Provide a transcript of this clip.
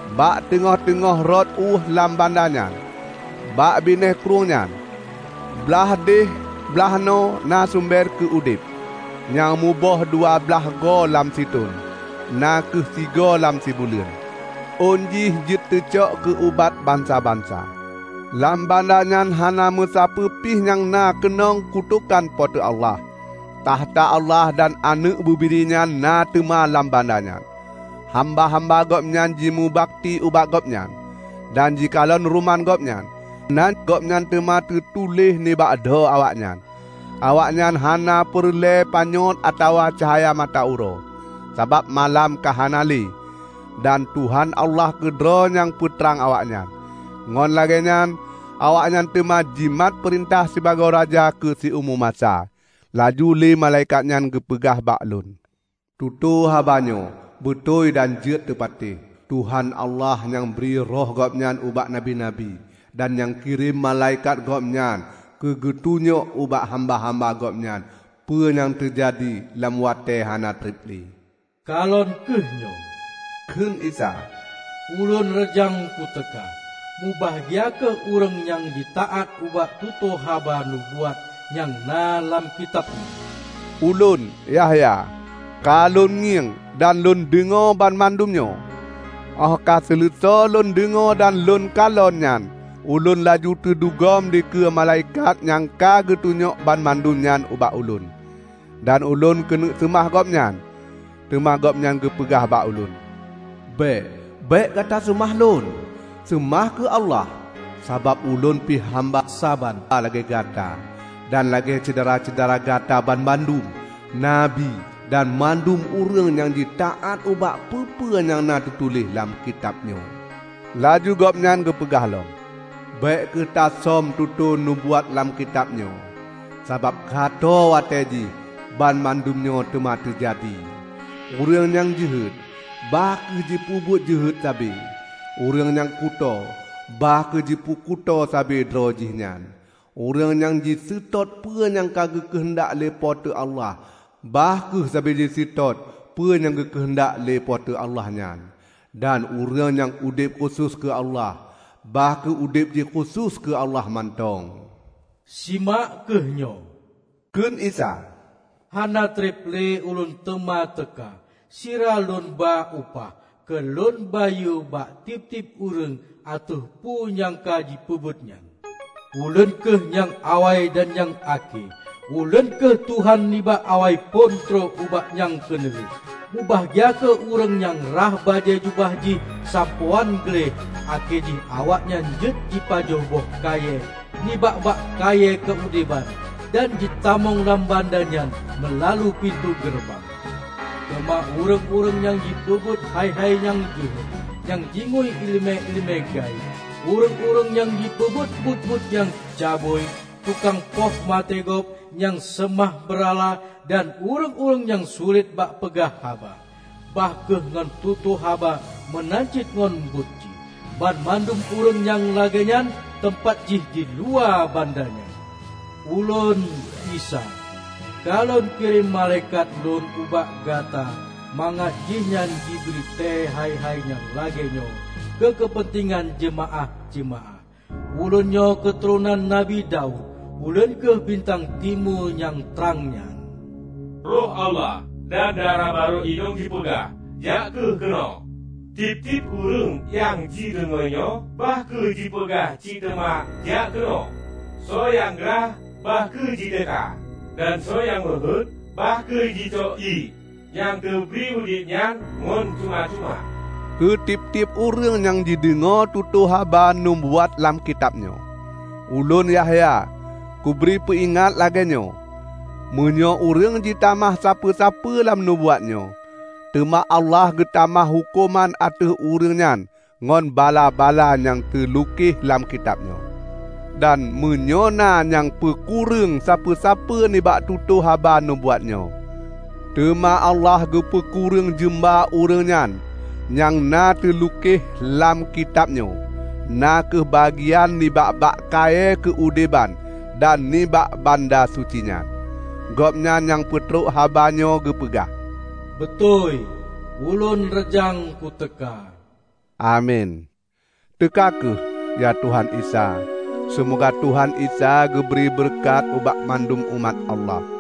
bak teungoh-teungoh rot ueh lam banda nyan. Bak binéh krueng nyan, blaih deh blaih noe na sumber keu udeb, nyang muboh dua blaih goe lam sithon, na kheueh sigoe lam sibuleuen. Ôn jih jeuet teucok keu ubat bansa-bansa. Lam banda nyan hana meusapeue pih nyang na keunong kutokan Po teu Allah. Takhta Allah dan Aneuëk Bubiri nyan na teuna lam banda nyan. Hamba-hamba Gobnyan jimeubakti ubak Gobnyan, dan jikalon ruman Gobnyan. Nan Gobnyan teuma teutu1éh nibak dho awaknyan. Awaknyan hana peureulée panyöt atawa cahya mata uroe, sabab malam ka hana lé, dan Tuhan Allah keudroe nyang peutrang awaknyan. Ngon lagée nyan awaknyan teuma jimat peurintah sibagoe raja keu siumu masa. Laju lé malaikat nyan geupeugah bak lôn, "Tutoe haba nyoe beutôi dan jeuet teupatéh. Tuhan Allah nyang bri Roh Gobnyan ubak nabi-nabi, dan nyang kirém malaikat Gobnyan keugeutunyok ubak hamba-hamba Gobnyan peue nyang teujadi lam watée hana treb lé." "Kalon kheueh nyoe!" kheun Isa, "Ulôn reujang kuteuka. Mubahgia kheueh ureuëng nyang jitaát ubak tutoe haba nubuat nyang na lam kitab nyoe!" Ulôn, Yahya, ka lôn ngieng dan lôn deungoe banmandum nyoe. Óh ka seuleusoe lôn deungoe dan lôn kalon nyan ulôn laju teudugom dikeue malaikat nyang ka geutunyok banmandum nyan ubak ulôn, dan ulôn keuneuk seumah gobnyan, teuma gobnyan geupeugah bak ulôn, "Bék! Bék gata seumah lôn! Seumah kheueh Allah! Sabab ulôn pih hamba saban lagée gata, dan lagée syedara-syedara gata banmandum nabi dan mandum ureuëng nyang jitaát ubak peue-peue nyang na teutuléh lam kitab nyoe!" Laju gobnyan geupeugah lom, "Bék kheueh tasöm tutoe nubuat lam kitab nyoe, sabab ka tho watée jih banmandum nyoe teuma teujadi. Ureuëng nyang jeuhet, bah kheueh jipeubuet jeuhet sabe; ureuëng nyang kutoe, bah kheueh jipeukuto sabe droe jih nyan; ureuëng nyang jiseutôt peue nyang geukeuheundak lé Po teu Allah, bah kheueh sabe jiseutôt peue nyang geukeuheundak lé Po teu Allah nyan, dan ureuëng nyang udeb khusos keu Allah, bah kheueh udeb jih khusos keu Allah mantong." "Simak kheueh nyoe!" kheun Isa, "Hana treb lé Ulôn teuma teuka sira Lôn ba upah keu Lôn bayeue bak tieb-tieb ureuëng ateueh peue nyang ka jipeubuet nyan. Ulôn kheueh nyang awai dan nyang akhé; Ulôn kheueh Tuhan nibak Awai phon trok ubak nyang Keuneulheueh." Mubahgia kheueh ureuëng nyang rhah bajée jubah jih sampoe án gleh akhé jih awaknyan jeuet jipajoh boh kayée nibak bak kayée keu udeban dan jitamong lam banda nyan meulalu pintoe geureubang. Teuma ureuëng-ureuëng nyang jipeubuet hai-hai nyang jeuhet, nyang jingui iéleumé-iéleumé gaéb, ureuëng-ureuëng nyang jipeubuet buet-buet nyang cabui, tukang poh maté gob, nyang seumah beurala, dan ureuëng-ureuëng nyang sulet bak peugah haba, bah kheueh ngon tutoe haba meunan cit ngon buet jih, banmandum ureuëng nyang lagée nyan teumpat jih diluwa banda nyan. "Ulôn, Isa, ka lôn kirém malaikat Lôn ubak gata mangat jihnyan jibri tée hai-hai nyang lagée nyoe keu keupeuntengan jeumaáh-jeumaáh. Ulôn nyoe keuturonan nabi Daud; Ulôn kheueh bintang timu nyang trang nyan." Roh Allah dan Dara barô Inong jipeugah, "Jak kheueh keunoe!" Tieb-tieb ureuëng nyang jideungoe nyoe bah kheueh jipeugah cit teuma, "Jak keunoe!" Soe nyang grah, bah kheueh jiteuka! Dan soe nyang meuheuét, bah kheueh jicok ié nyang teubri udeb nyan ngon cuma-cuma. Keu tieb-tieb ureuëng nyang jideungoe tutoe haba nubuat lam kitab nyoe, ulôn, Yahya, kubri peuingat lagée nyoe: meunyoe ureuëng jitamah sapeue-sapeue lam nubuat nyoe, teuma Allah geutamah huköman ateueh ureuëng nyan ngon bala-bala nyang teulukeh lam kitab nyoe. Dan meunyoe na nyang peukureueng sapeue-sapeue nibak tutoe haba nubuat nyoe, teuma Allah geupeukureueng jeumba ureuëng nyan nyang na teulukeh lam kitab nyoe -- na kheueh bagian nibak bak kayée keu udeban dan nibak banda suci nyan. Gobnyan nyang peutrok haba nyoe geupeugah, "Beutôi, Ulôn reujang ku teuka!" Amin! Teuka kheueh, ya Tuhan Isa! Seumoga Tuhan Isa geubri beureukat ubak banmandum umat Allah!